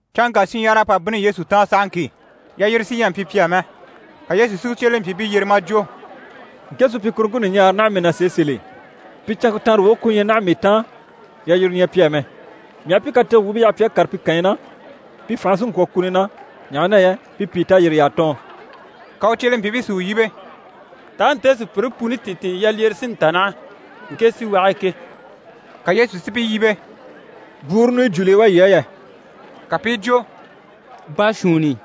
Canŋka shinɲyahara à pa bínni Yesu taan sahaŋki, yalyire sí ɲyɛ a mpyi pi á mɛ, ka Yesu si u cyelempyiibii yyere maa jwo: «Ŋke supyikuruŋke ɲùɲaare naha mii na sèe sèl'e, pi canŋke taanre woge ku ɲyɛ naha mii taan, yalyire ɲyɛ pi á mɛ. Mii aha pi katege wuubii yaha a kàre pi kànyi na, pi fànhe sí n‑kwɔ̀ kuni na, ɲaha na yɛ pi pìi tayiriy'à tɔɔn.» Ka u cyelempyiibii si u yíbe: «Taa nte sùpyire puni tìntin yalyire sí n‑ta naha ŋke síwage e ke?» Ka Yesu si pi yíbe: «Bwúuru ɲùnyɔ jùuli yi wá yii á yɛ?» Ka pi i jwo: «Baashuunni.»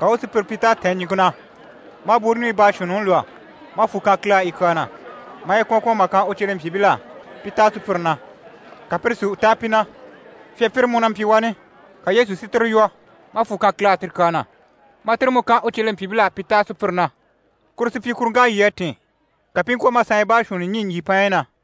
Ka u u sùpyire pyi t'à tɛ̀ɛn ɲìŋke na. Maa bwúuru ɲùɲyi baashuunniŋi lwɔ́, maa fwù kan Kile á yi kyaa na, maa yi kwɔ̀n kwɔ̀n mà kan u cyelempyiibil'á pi táa sùpyire na, ka pire si u táa pi na. Fyapyire mú na mpyi wani, ka Yesu si tire lwɔ́, maa fwù kan Kile á ti kyaa na, maa tire mú kan u cyelempyiibil'á pi táa sùpyire na. Kuru supyikuruŋk'à lyî a tìn, ka pi i ŋkwɔ̀ maa saanya baashuunni ɲî ɲjyìpaanyi na.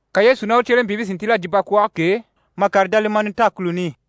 Ka Yesu ná u cyelempyiibii si ntíl'a jyè bakwɔɔge k'e mà kàre Dalimanuta kùluni i.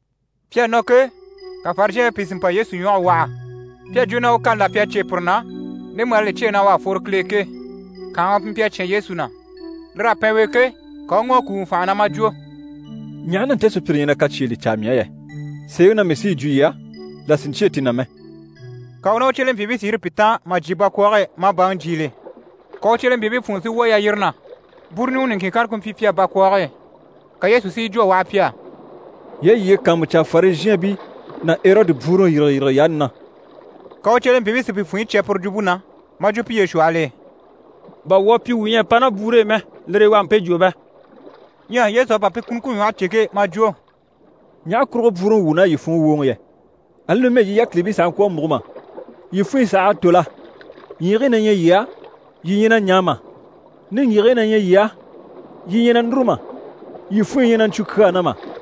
Pi à nɔ ke, ka Farizhɛɛnbii pìi si mpa Yesu ɲwɔge waha. Pi à jwo na u kani là pyi u cyêe pire na ndemu l'à li cyêe u à fworo Kile e ke. Kànhaŋa pi mpyi a cyán Yesu na. Lir'à pɛn u e ke, ka u u ŋɔ̀ a kùuŋɔ fànhe na, maa jwo: «Ɲaha na nte sùpyire ɲyɛ na kacyeele caa mii á yɛ? Sèeŋi na mii sí yi jwo yii á, là sì n‑cyêe ti na mɛ.» Ka u ná u cyelempyiibii si yîri pi taan mà jyè bakwɔɔge e, maa baŋi jyiile. Ka u cyelempyiibii funŋɔ si wwɔ̀ yalyire na, bwúuru ɲùŋɔ niŋkin kanna ku mpyi pi á bakwɔɔge e. Ka Yesu si yi jwo a waha pi á: «Yii a yiye kàanmucaa Farizhɛɛnbii ná Erɔdi bwúuruŋi yîrigeyirige yaani na.» Ka u cyelempyiibii si pi funɲyi cya puru jwumpe na, maa jwo piye shwɔhɔl'e: «Bà wuu à pyi wuu ɲyɛ a pa ná bwúuru i mɛ, lire e u à mpe jwo bɛ?» Ɲyɛ Yesu à pa pi kunuŋke ɲwɔhe cè ke, maa jwo: «Ɲaha kurugo bwúuruŋi wuun'à yii funŋɔ wwòoŋɔ yɛ? Ali numɛ yii yákilibii sàha ŋkwɔ̀ a múgo mà? Yii funɲyi saha à tò la? Ɲyiigii na ɲyɛ yii á, yii ɲyɛ na ɲaa mà? Niŋgyigigii na ɲyɛ yii á, yii ɲyɛ na núru mà? Yii funɲyi ɲyɛ na ɲcwu kyaa na mà?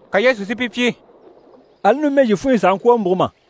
Ka Yesu si pi pyi: «Ali numɛ, yii funɲyi sàha ŋkwɔ̀ a múgo mà?»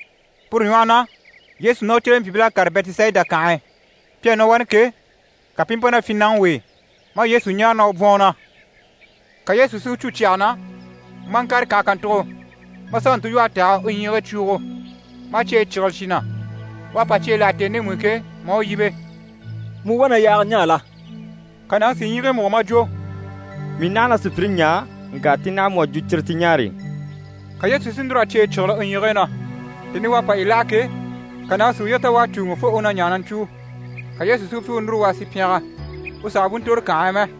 Puru ɲwɔhɔ na, Yesu ná u cyelempyiibil'à kàre Bɛtisayida kànhe e. Pi à nɔ wani ke, ka pi i mpa ná fyinnaŋi w'e, maa Yesu ɲáare na u bwɔ̀n u na. Ka Yesu si u cû cyɛge na, maa ŋkàre kànhe kàntugo, maa sà u ntilwɔhe tɛ̀g'a u ɲyiigii cwuugo, maa cyeyi cyígile cyi na. U à pa cyeyi láha tèni ndemu i ke, maa u yíbe: «Mu wá na yaaga ɲaa la?» Ka nàŋi si ɲyiigii múgo maa jwo: «Mii naha na sùpyire ɲaa, ŋka ti naha mu à jwo cire ti ɲaare.» Ka Yesu si núr'a cyeyi cyígile u ɲyiigii na, tèni i u à pa yi láha ke, ka nàŋi si uye ta u à cùuŋɔ, fo u na ɲaa na ɲcwúu. Ka Yesu si u pyi u núru, u a sì pyɛngɛ, u sàha bú ntòro kànhe e mɛ.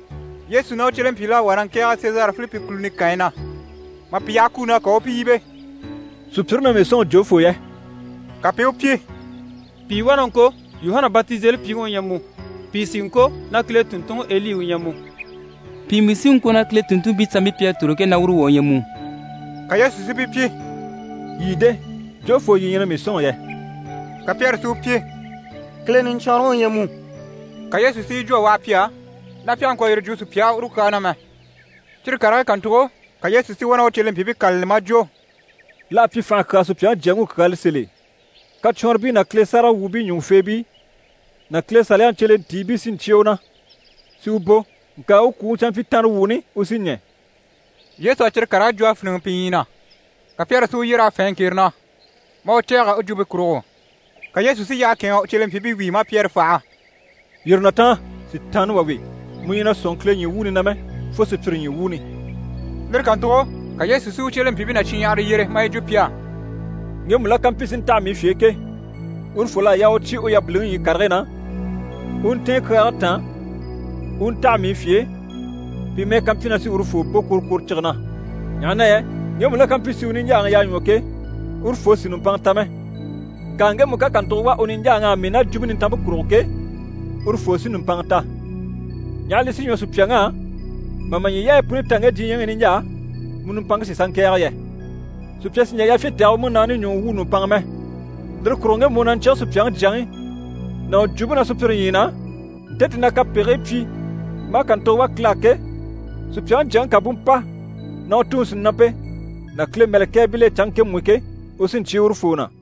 Yesu ná u cyelempyiibil'à wá na ŋkɛ̀ɛge Sezare Filipi kùluni kànyi na. Mà pi yaha kuni na, ka u u pi yíbe: «Sùpyire na mii sɔ̂nŋi jofoo yɛ?» Ka pi i u pyi: «Pìi wá na ŋko Yuhana Batizelipyiŋi u ɲyɛ mu, pìi sí i ŋko na Kile tùnntunŋi Eli u ɲyɛ mu, pìi mú sí i ŋko na Kile tùnntunmpii sanmpii pi à tòro ke, na uru wà u ɲyɛ mu.» Ka Yesu si pi pyi: «Yii de? Jofoo yii ɲyɛ na mii sɔ̂nŋi yɛ?» Ka Pyɛri si u pyi: «Kile Niɲcwɔnrɔŋi u ɲyɛ mu.» Ka Yesu si yi jwo a waha pi á, na pi àha ŋkwɔ̀ yire jwo sùpya á uru kyaa na mɛ. Cyire karigii kàntugo, ka Yesu si wá na u cyelempyiibii kâlali, maa jwo: «L'à pyi fànha kyaa Supyaŋi Jyaŋi u kyaala sèl'e. Kacwɔnribii ná Kile sáragawwuubii ɲùŋufeebii ná Kile Saliyaŋi cyelentiibii sí n‑cyé u na, si u bò. Ŋka u kwùŋi canmpyitanrewuuni u sí ɲɛ̀.» Yesu à cyire karigii jwo a fíniŋɛ pi ɲyii na. Ka Pyɛri si u yyer'a fɛ̂ɛn ŋkere na, maa u cɛ̂ɛgɛ u jwumpe kurugo. Ka Yesu si yyahe kɛ̂ɛnŋ'a u cyelempyiibii wíi, maa Pyɛri faha: «Yîri na taan, Sitaanna wà we! Mu ɲyɛ na sɔ̂nŋi Kile ɲyii wuuni na mɛ, fo sùpyire ɲyii wuuni!» Lire kàntugo ka Yesu si u cyelempyiibii ná shinɲyahara yyere, maa yi jwo pi á: «Ŋgemu la ká mpyi si ntaha mii fye e ke, urufol'à yaa u cyé u yabiliŋi ɲyii karigii na, u u ntɛ̀ɛn kyaage taan u u ntaha mii fye e, pi mɛ́ɛ ká mpyi na sí urufoo bò kworokworocige na. Ɲaha na yɛ ŋgemu la ká mpyi si u niɲjaaŋi yaa ɲwɔ ke, urufoo sì nùmpanŋa ta mɛ, ŋka ŋgemu ká kàntugo wà u niɲjaaŋ'á mii ná Jwumpe Nintanmpe kurugo ke, urufoo sí nùmpanŋa ta. Ɲaha li sí ɲwɔ sùpyaŋ'á mà ma ɲyii yaayi puni ta ŋge diɲyɛŋi i niɲjaa, mu nùmpanŋke si sà ŋkɛ̀ɛge yɛ? Sùpya sì n‑jà yafyin tɛ̀gɛ u múnaani ɲùŋɔ wwû nùmpanŋa mɛ. Lire kurugo ŋgemu u na ɲcyíge Supyaŋi Jyaŋi ná u jwumpe na sùpyire ɲyii na, nte ti na kapegigii pyi maa kàntugo wà Kile á ke, Supyaŋi Jyaŋi ká bú mpa ná u Tuŋi sìnampe ná Kile mɛ̀lɛkɛɛbil'e canŋke ŋkemu i ke, u sí n‑cyé urufoo na.